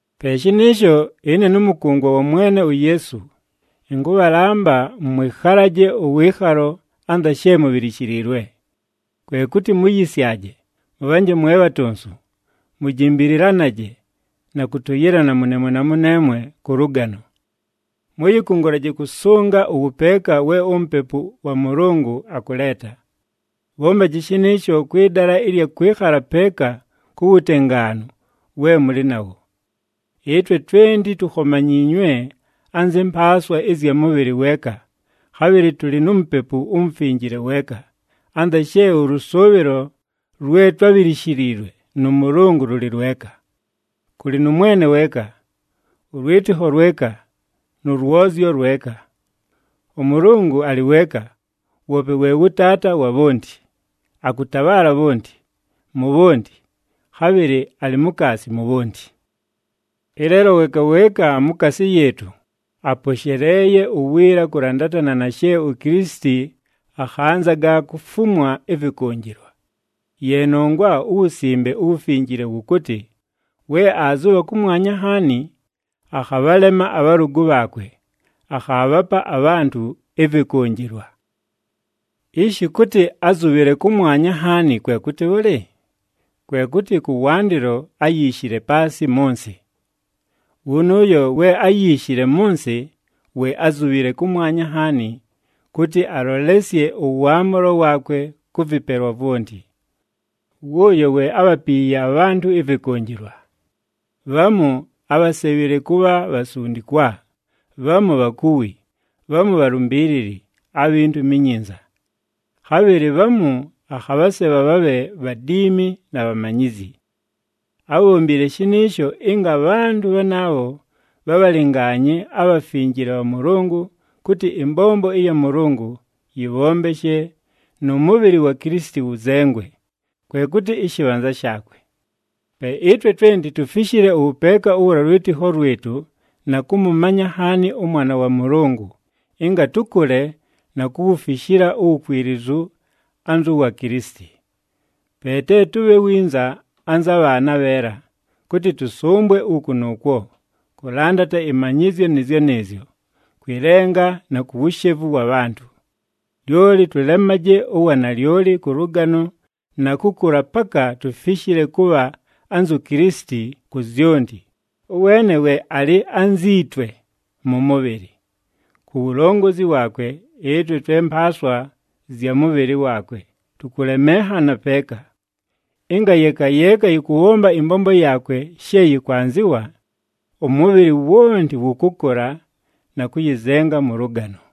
Pe shɨnɨɨsho ɨne nʉmʉkʉngwa wa Mwene uYeesu, ɨnkʉbhalamba mwɨkhalaje ʉwɨɨkhalo anza she mubhilishiliilwe. Kwe kʉtɨ muyisyaje, mʉbhanje mwe bhatonsu, mujimbililanaje na kʉtʉyɨlana mʉneemwe na mʉneemwe kʉ lʉgano. Mʉyɨkʉngʉlaje kʉsʉnga ʉwʉpeeka we uMupepu wa Mʉlʉngʉ akʉleeta. Bhombaji shɨnɨɨsho kwɨ dala ɨlya kwɨkhala peeka ku wutengaanu we mʉlɨ nawo. Ɨtwe twenti tukhomanyiinywe anzɨ mpaaswa ɨzya mʉbhɨlɨ weeka, khabhɨlɨ tʉlɨ nu Mupepu uMufinjile weeka, anza she ʉlʉsʉʉbhɨlo lwe twábhilishiliilwe nʉ Mʉlʉngʉ lʉlɨ lweka. Kʉlɨ nʉ Mwene weeka, ʉlwɨtɨkho lweka nʉ lwozyo lweka. ɄMʉlʉngʉ alɨ weeka, woope we wʉ Taata wa bhonti. Akʉtabhaala bhonti, mu bhonti, khabhɨlɨ alɨ mukaasi mu bhonti. Ɨleelo weeka weeka mukaasi yɨɨtʉ aposheleeye uwiila kʉlandatana na she uKilisiti akhanzaga kufumwa ɨvɨkʉnjɨlwa. Ye nongwa uWusimbe uWufinjile wʉkʉtɨ, “We aazʉbha kʉmwanya nhaani, akhabhalema abhalʉgʉ bhaakwe, akhaabhapa abhantʉ ɨvɨkʉnjɨlwa.” Ishi kʉtɨ, “Ázubhile kʉmwanya nhaani,” kwe kʉtɨ bhʉlɨ? Kwe kʉtɨ, kʉwandɨlo áyiishile paasɨ mʉ nsɨ. Wʉnʉʉyo we áyiishile mʉ nsɨ, we ázubhile kʉmwanya nhaani, kʉtɨ alolesye ʉwaamʉlo waakwe kʉ vɨpelwa vwonti. Wʉʉyo we ábhapiiye abhantʉ ɨvɨkʉnjɨlwa. Bhamu ábhasebhile kʉbha bhasundikwa, bhamu bhakuwi, bhamu bhalumbiilili abhi Ntumi iNyinza. Khabhɨlɨ bhamu akhabhasebha bhabhe bhadiimi na bhamanyizyi. Ábhombile shɨnɨɨsho ɨnga abhantʉ bhanaabho bhabhalɨngaanye abhafinjile bha Mʉlʉngʉ, kʉtɨ ɨmbombo ɨya Mʉlʉngʉ yɨbhombeshe nʉ mʉbhɨlɨ wa Kilisiti wʉzengwe, kwe kʉtɨ ɨshɨbhanza shaakwe. Pe ɨtwe twenti tufishile ʉwʉpeeka ʉwa lwɨtɨkho lwɨtʉ na kʉmʉmanya nhaani ʉMwana wa Mʉlʉngʉ, ɨnga tʉkʉle na kuwufishila uwukwilizu anzʉ wa Kilisiti. Pe te tʉbhe winza anza bhaana abheela, kʉtɨ tʉsʉmbwe uku nʉʉkwo, kʉlandata ɨmanyɨzyo nɨɨzyo nɨɨzyo, kwɨ lenga na ku wushevu wa bhantʉ. Lyoli tʉlemaje uwanalyoli kʉ lʉgano na kʉkʉla paka tufishile kʉbha anzu Kilisiti ku zyonti, ʉweene we alɨ anzi twe mʉ mʉbhɨlɨ. Ku wulongozi waakwe ɨtwe twe mpaaswa zya mʉ mʉbhɨlɨ waakwe tʉkʉlemenhana peeka. Ɨnga yeeka yeeka yɨkʉbhomba ɨmbombo yaakwe she yɨkwanzɨwa, ʉmʉbhɨlɨ wonti wʉkʉkʉla na kʉyɨzenga mʉ lʉgano.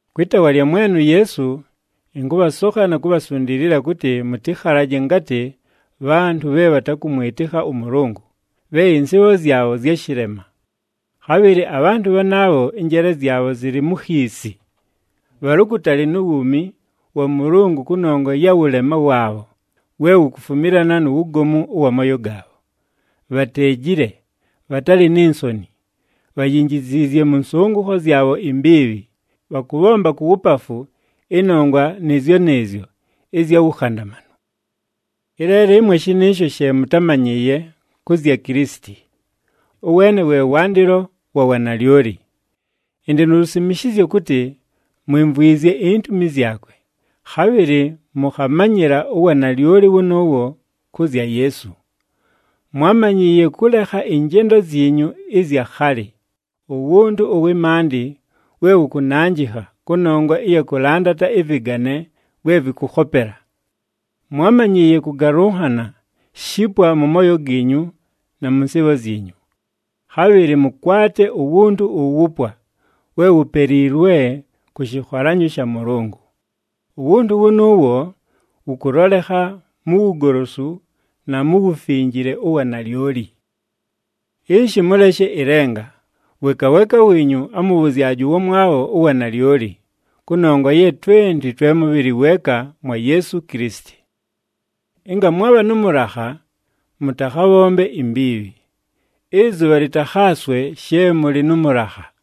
Kwɨ taawa lya Mwene uYeesu, ɨnkʉbhasokha na kubhasundiilila kʉtɨ mʉtɨkhalaje ngatɨ bhantʉ bhe bhatakʉmwɨtɨkha ʉMʉlʉngʉ, bhe ɨnsɨɨbho zyabho zya shɨlema. Khabhɨlɨ abhantʉ bhanaabho ɨnjeele zyabho zɨlɨ mu khiisi. Bhalɨ ukutali nu wuumi wa Mʉlʉngʉ kʉnongwa ya wʉlema waabho we wukufumilana nu wugomu ʉwa mooyo gaabho. Bhateejile, bhatalɨ ni nsoni, bhayinjiziizye mʉ nsʉngʉkho zyabho imbiibhi, bhakʉbhomba ku wupafu ɨnongwa nɨɨzyo nɨɨzyo ɨzya wukhandamanu. Ɨleelo ɨmwe shɨnɨɨsho she mʉtámanyɨɨye kʉ zya Kilisiti. Ʉweene we wandɨlo wa wanalyoli. Ɨndɨ nu lusimishizyo kʉtɨ mwimvwizye intumi zyakwe, khabhɨlɨ mʉkhamanyɨla uwanalyoli wʉnʉʉwo kʉ zya Yeesu. Mwámanyɨɨye kʉlekha ɨnjendo zyinyu ɨzya khalɨ, uwuntu ʉwɨ maandɨ we wʉkʉnanjɨkha kʉnongwa ɨya kʉlandata ɨvɨgane vwe vɨkʉkhopela. Mwámanyɨɨye kʉgalʉnhana shipwa mʉ mooyo giinyu na mʉ nsɨɨbho zyinyu. Khabhɨlɨ mʉkwate uwuntu uwupwa, we wupeliilwe kʉ shɨkholanyo sha Mʉlʉngʉ. Uwuntu wʉnʉʉwo wʉkʉlolekha mu wugolosu na mu wufinjile ʉwa nalyoli. Ishi mʉleshe ɨlenga, weeka weeka wiinyu amʉbhʉzyaje ʉwamwabho uwanalyoli, kʉnongwa ye twenti twe mʉbhɨlɨ weeka mwa Yeesu Kilisiti. Ɨnga mwabha nʉ mʉlakha, mʉtakhabhombe imbiibhi. Ɨzʉbha lɨtakhaaswe she mʉlɨ nʉ mʉlakha.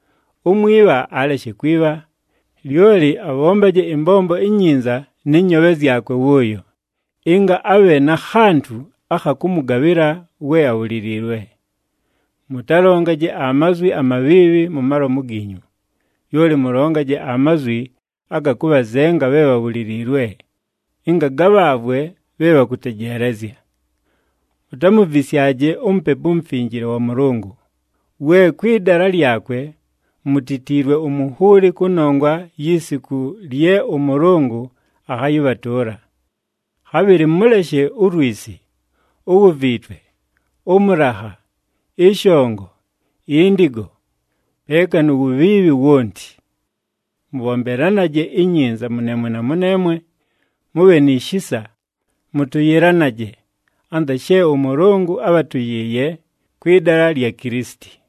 Umwibha aleshe kwibha, lyoli abhombaje ɨmbombo inyinza nɨ nyoobhe zyakwe wʉʉyo, ɨnga abhe na khantʉ akha kʉmʉgabhɨla we abhuliliilwe. Mʉtalongaje amazwi amabhiibhi mu malomu giinyu. Lyoli mʉlongaje amazwi aga kʉbhazenga bhe bhabhuliliilwe, ɨnga gabhaavwe bhe bhakʉtejeelezya. Mutamuvisyaje uMupepu uMufinjile wa Mʉlʉngʉ, we kwɨ dala lyakwe mutitiilwe umunhuuli kʉnongwa yi siku lye ʉMʉlʉngʉ akhayɨbhatʉʉla. Khabhɨlɨ mʉleshe ulwisi, uwuviitwe, ʉmʉlakha, ɨshongo, indigo, peeka nu wubhiibhi wonti. Mʉbhombelanaje inyinza mʉneemwe na mʉneemwe, mʉbhe ni shisa, mʉtʉyɨlanaje anza she ʉMʉlʉngʉ ábhatʉyɨɨye kwɨ dala lya Kilisiti.